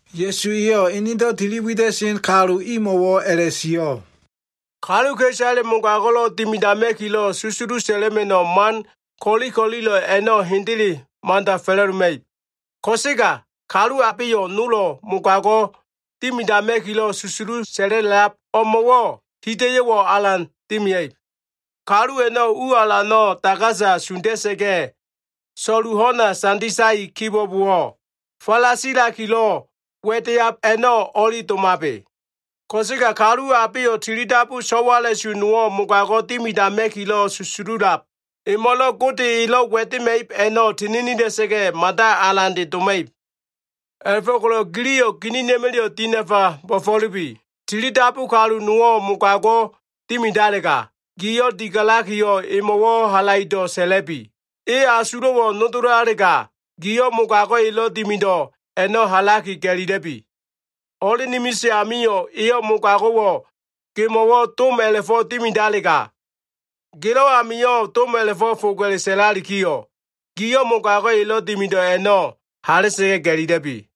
Ya꞉su eyo꞉ enedo꞉ tili wida꞉sen kalu imo꞉wo꞉ a꞉la꞉sio꞉, “Kaluka꞉isale mogago꞉lo꞉ dimidama꞉kilo꞉ susulu sa꞉la꞉ma꞉no꞉ man ko꞉li ko꞉lilo꞉ a꞉no꞉ hendele mada fa꞉la꞉doma꞉ib. Ko꞉sega kalu abeyo꞉ nolo꞉ mogago꞉ dimidama꞉kilo꞉ susulu sa꞉la꞉lab o꞉mo꞉wo꞉ hida꞉yo꞉wo꞉ alan dimia꞉ib. Kalu a꞉no꞉ u alano꞉ dagasa sunda꞉sa꞉ga꞉, so꞉lu ho꞉na sanditai kibo꞉bowo꞉, falasilakilo꞉ wa꞉deab a꞉no꞉ o꞉li domabe. Ko꞉sega kalu abeyo꞉ tilidabu so꞉wala꞉su nowo꞉ mogago꞉ dimidama꞉kilo꞉ susululab emo꞉lo꞉ Gode elo꞉ wa꞉dema꞉ib a꞉no꞉ tininila꞉sa꞉ga꞉, mada alande doma꞉ib. A꞉la꞉fo꞉ko꞉lo꞉ giliyo꞉ ginina꞉ma꞉la꞉yo꞉ dinafa bo꞉fo꞉lubi! Tilidabu kalu nowo꞉ mogago꞉ dimidalega, giyo꞉ digalakiyo꞉ emo꞉wo꞉ halaido꞉ sa꞉la꞉bi. E asulo꞉wo꞉ nodolalega, giyo꞉ mogago꞉ elo꞉ dimido꞉ a꞉no꞉ hala꞉sa꞉ga꞉ ga꞉lila꞉bi. Ho꞉len imilise amio꞉, e mogago꞉wo꞉ gemo꞉wo꞉ dom a꞉la꞉fo꞉ dimidalega, gelo꞉ amio꞉ dom a꞉la꞉fo꞉ foga꞉le sa꞉lalikiyo꞉, giyo꞉ mogago꞉ elo꞉ dimido꞉ a꞉no꞉ hala꞉sa꞉ga꞉ ga꞉lila꞉bi.”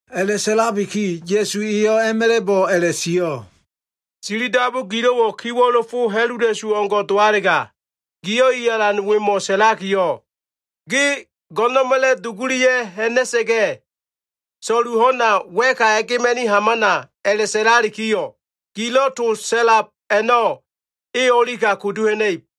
A꞉la꞉sa꞉labiki, Ya꞉su eyo꞉ a꞉ma꞉la꞉bo꞉ a꞉la꞉sio꞉, “Tilidabu gililo꞉wo꞉ kiwo꞉lo fo ha꞉lula꞉su o꞉ngo꞉ dowalega, giyo꞉ i alan wemo꞉ sa꞉lakiyo꞉, ‘Ge go꞉no꞉na꞉ma꞉la꞉ dugulia꞉ ha꞉na꞉sa꞉ga꞉, so꞉lu ho꞉na wa꞉ka a꞉gema꞉ni hamana’ a꞉la꞉sa꞉lalikiyo꞉, gilo꞉ to sa꞉lab a꞉no꞉ e o꞉lika kudu ha꞉na꞉ib.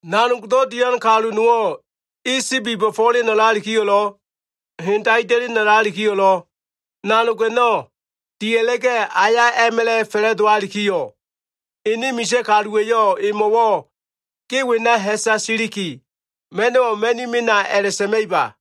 “Nanogdo꞉ dian kalu nowo꞉ e sibi bo꞉fo꞉len a꞉lalikiyo꞉lo꞉, hen daida꞉len a꞉lalikiyo꞉lo꞉, nanog a꞉no꞉ dia꞉la꞉ga꞉ aya a꞉ma꞉la꞉ fa꞉la꞉dowalikiyo꞉, ene misa꞉ kaluwa꞉yo꞉ emo꞉wo꞉ ‘ge wena ha꞉sa siliki ma꞉no꞉wo꞉ ma꞉ni mena’ a꞉la꞉sa꞉ma꞉iba?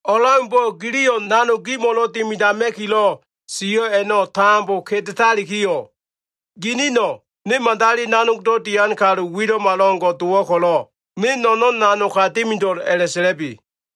O꞉leaumbo꞉ giliyo꞉ nanog gimo꞉lo꞉ dimidama꞉kilo꞉ sio꞉ a꞉no꞉ tambo kedetalikiyo꞉, ginino꞉ ‘Ne madali nanog dian kalu wilo꞉malo꞉ngo꞉ dowo꞉ ko꞉lo꞉, ne no꞉no꞉n nanog ka dimido꞉l’ a꞉la꞉sa꞉la꞉bi.”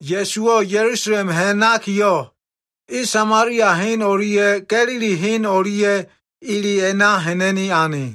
Ya꞉suwo꞉ Ya꞉lusalem ha꞉nakiyo꞉, e Samalia hen o꞉lia꞉ Ga꞉lili hen o꞉lia꞉ ele a꞉na ha꞉na꞉ni ane.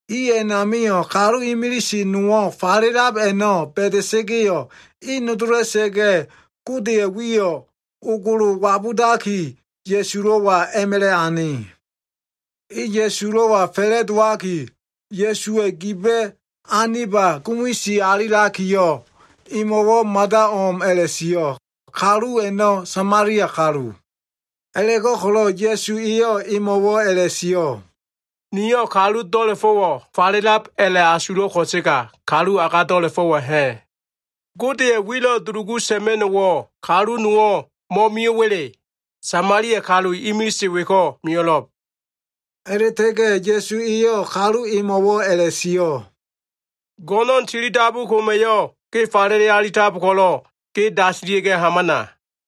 I a꞉namio꞉ kalu imilise nowo꞉ falelab a꞉no꞉ ba꞉da꞉sa꞉ga꞉yo꞉, e nodola꞉sa꞉ga꞉, Godeya꞉ wiyo꞉ ogolo wabudaki Ya꞉sulo꞉wa a꞉ma꞉la꞉ ane. E Ya꞉sulo꞉wa fa꞉la꞉dowaki, Ya꞉suwa꞉ giba꞉ aniba gumisi alilakiyo꞉, emo꞉wo꞉ mada o꞉m a꞉la꞉sio꞉. Kalu a꞉no꞉ Samalia kalu. A꞉la꞉go꞉ko꞉lo꞉ Ya꞉su eyo꞉ emo꞉wo꞉ a꞉la꞉sio꞉, “Niyo꞉ kalu do꞉la꞉fo꞉wo꞉ falelab a꞉la꞉asulo꞉ ko꞉sega kalu agado꞉la꞉fo꞉wo꞉ ha꞉? Godeya꞉ wilo꞉ dulugu sa꞉ma꞉no꞉wo꞉ kalu nowo꞉ mo꞉mio꞉wa꞉le? Samalia kalu imilise weko꞉ mio꞉lo꞉b.” A꞉la꞉ta꞉ga꞉ Ya꞉su eyo꞉ kalu emo꞉wo꞉ a꞉la꞉sio꞉, “Go꞉no꞉n tilidabu koma꞉yo꞉ ge falele alitab ko꞉lo꞉, ge dasilia꞉ga꞉ hamana.”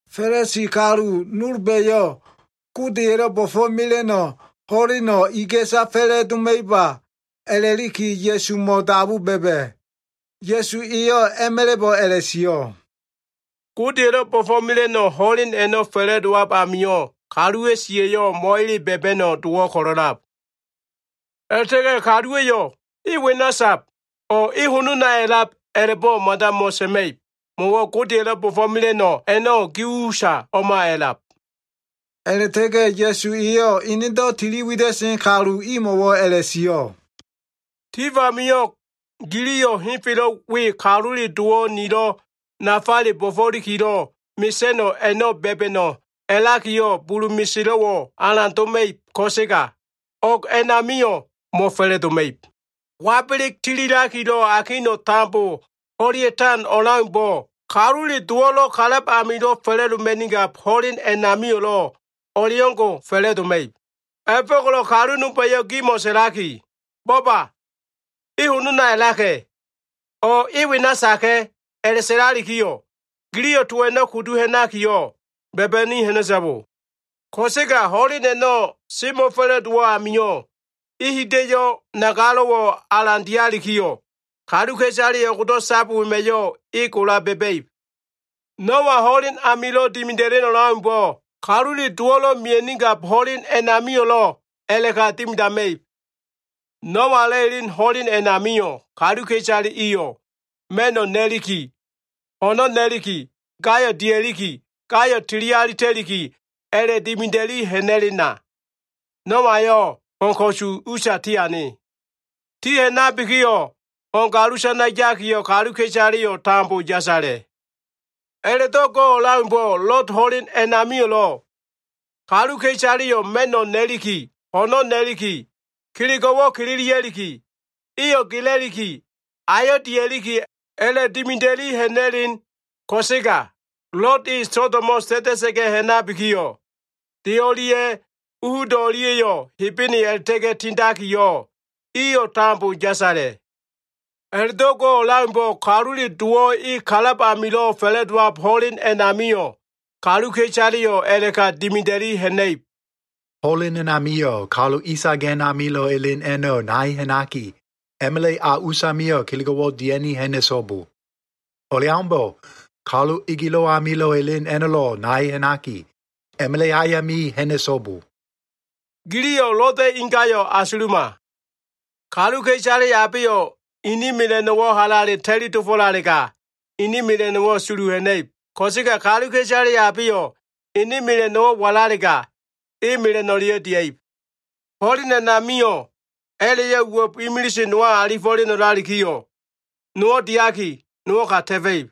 Fa꞉lisi kalu nolba꞉yo꞉ Godeya꞉lo꞉ bo꞉fo꞉mela꞉no꞉ ho꞉leno꞉ iga꞉sa fa꞉la꞉doma꞉iba a꞉la꞉liki Ya꞉sumo꞉ a꞉la꞉dabu ba꞉ba꞉. Ya꞉su eyo꞉ a꞉ma꞉la꞉bo꞉ a꞉la꞉sio꞉, “Godeya꞉lo꞉ bo꞉fo꞉mela꞉no꞉ ho꞉len a꞉no꞉ fa꞉la꞉dowab amio꞉, kaluwa꞉ siya꞉yo꞉ mo꞉ele ba꞉ba꞉no꞉ dowo꞉ ko꞉lo꞉lab. A꞉la꞉ta꞉ga꞉ kaluwa꞉yo꞉ ‘E wena sab’ o꞉ ‘E honona a꞉lab’ a꞉la꞉bo꞉ mada mo꞉sa꞉ma꞉ib. Mo꞉wo꞉ Godeya꞉lo꞉ bo꞉fo꞉mela꞉no꞉ a꞉no꞉ gi usa o꞉ma a꞉lab.” A꞉la꞉ta꞉ga꞉ Ya꞉su eyo꞉ enedo꞉ tiliwida꞉sen kalu imo꞉wo꞉ a꞉la꞉sio꞉, “Tif amio꞉ giliyo꞉ henfelo꞉ we Kalule Dowo꞉ nilo꞉ nafale bo꞉fo꞉likilo꞉ mesa꞉no꞉ a꞉no꞉ ba꞉ba꞉no꞉ a꞉lakiyo꞉ bulu meselo꞉wo꞉ alan doma꞉ib ko꞉sega, o꞉g a꞉namio꞉ mo꞉fa꞉la꞉doma꞉ib. Wabeleg tililakilo꞉ akino꞉ tambolo꞉ ho꞉lea꞉tan o꞉leaumbo꞉, Kalule Dowo꞉lo꞉ kalab amilo꞉ fa꞉la꞉doma꞉nigab ho꞉len a꞉namio꞉lo꞉ o꞉leo꞉ngo꞉ fa꞉la꞉doma꞉ib. A꞉la꞉fo꞉ko꞉lo꞉ kalu nolba꞉yo꞉ gimo꞉ sa꞉laki, ‘Bo꞉ba! E honona a꞉laka꞉’ o꞉ ‘E wena yaka꞉’ a꞉la꞉sa꞉lalikiyo꞉, giliyo꞉ to a꞉no꞉ kudu ha꞉nakiyo꞉ ba꞉ba꞉ni ha꞉na꞉so꞉bo. Ko꞉sega ho꞉len a꞉no꞉ semo꞉fa꞉la꞉dowo꞉ amio꞉, e hida꞉yo꞉ nagalo꞉wo꞉ alan dialikiyo꞉, kaluka꞉isale o꞉go꞉do꞉ sab wema꞉yo꞉ e gola ba꞉ba꞉ib. “Noa ho꞉len amilo꞉ dimida꞉len o꞉leaumbo꞉, Kalule Dowo꞉ mia꞉nigab ho꞉len a꞉namio꞉lo꞉ a꞉la꞉ka dimidama꞉ib. Noa elo꞉ elen ho꞉len a꞉namio꞉, kaluka꞉isale iyo꞉ ma꞉no꞉ na꞉liki, ho꞉no꞉ na꞉liki, gayo꞉ dia꞉liki, gayo꞉ tili alita꞉liki a꞉la꞉dimida꞉li ha꞉na꞉lena, Noayo꞉ ho꞉n ko꞉su usa tiane. Ti ha꞉nabikiyo꞉, ho꞉n galusana yakiyo꞉ kaluka꞉isaleyo꞉ tambo yasala꞉. “A꞉la꞉do꞉ go꞉ o꞉leaumbo꞉, Lod ho꞉len a꞉namio꞉lo꞉ kaluka꞉isaleyo꞉ ma꞉no꞉ na꞉liki, ho꞉no꞉ na꞉liki, kelego꞉wo꞉ kililia꞉liki, eyo꞉ gela꞉liki, ayo꞉ dia꞉liki, a꞉la꞉dimida꞉li ha꞉na꞉len ko꞉sega, Lod e Sodomo꞉ ta꞉ta꞉sa꞉ga꞉ ha꞉nabikiyo꞉, de o꞉lia꞉ u hudo꞉ o꞉lia꞉yo꞉ Hebene a꞉la꞉ta꞉ga꞉ tindakiyo꞉, iyo꞉ tambo yasala꞉. A꞉la꞉do꞉ go꞉ o꞉leaumbo꞉, Kalule Dowo꞉ e kalab amilo꞉ fa꞉la꞉dowab ho꞉len a꞉namio꞉ kaluka꞉isaleyo꞉ a꞉la꞉ka dimida꞉li ha꞉na꞉ib. Ho꞉len a꞉namio꞉ kalu isagen amilo꞉ elen a꞉no꞉ nai ha꞉naki, a꞉ma꞉la꞉ a usamio꞉ kelego꞉wo꞉ dia꞉ni ha꞉na꞉so꞉bo. O꞉leaumbo꞉, kalu egelo꞉ amilo꞉ elen a꞉no꞉lo꞉ nai ha꞉naki, a꞉ma꞉la꞉ ayami ha꞉na꞉so꞉bo. Giliyo꞉ Loda꞉ ingayo꞉ asuluma. Kaluka꞉isale abeyo꞉ ene mela꞉no꞉wo꞉ halale ta꞉li dofo꞉lalega, ene mela꞉no꞉wo꞉ sulu ha꞉na꞉ib. Ko꞉sega kaluka꞉isale abeyo꞉ ene mela꞉no꞉wo꞉ walalega, e mela꞉no꞉leyo꞉ dia꞉ib. Ho꞉len a꞉namio꞉, a꞉la꞉yo꞉ uwo꞉b imilise nowa alifo꞉leno꞉lalikiyo꞉, nowo꞉ diaki, nowo꞉ ka ta꞉fa꞉ib.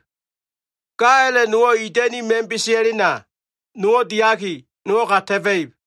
Ga a꞉la꞉ nowo꞉ ida꞉ni ma꞉n besea꞉lena, nowo꞉ diaki, nowo꞉ ka ta꞉fa꞉ib.”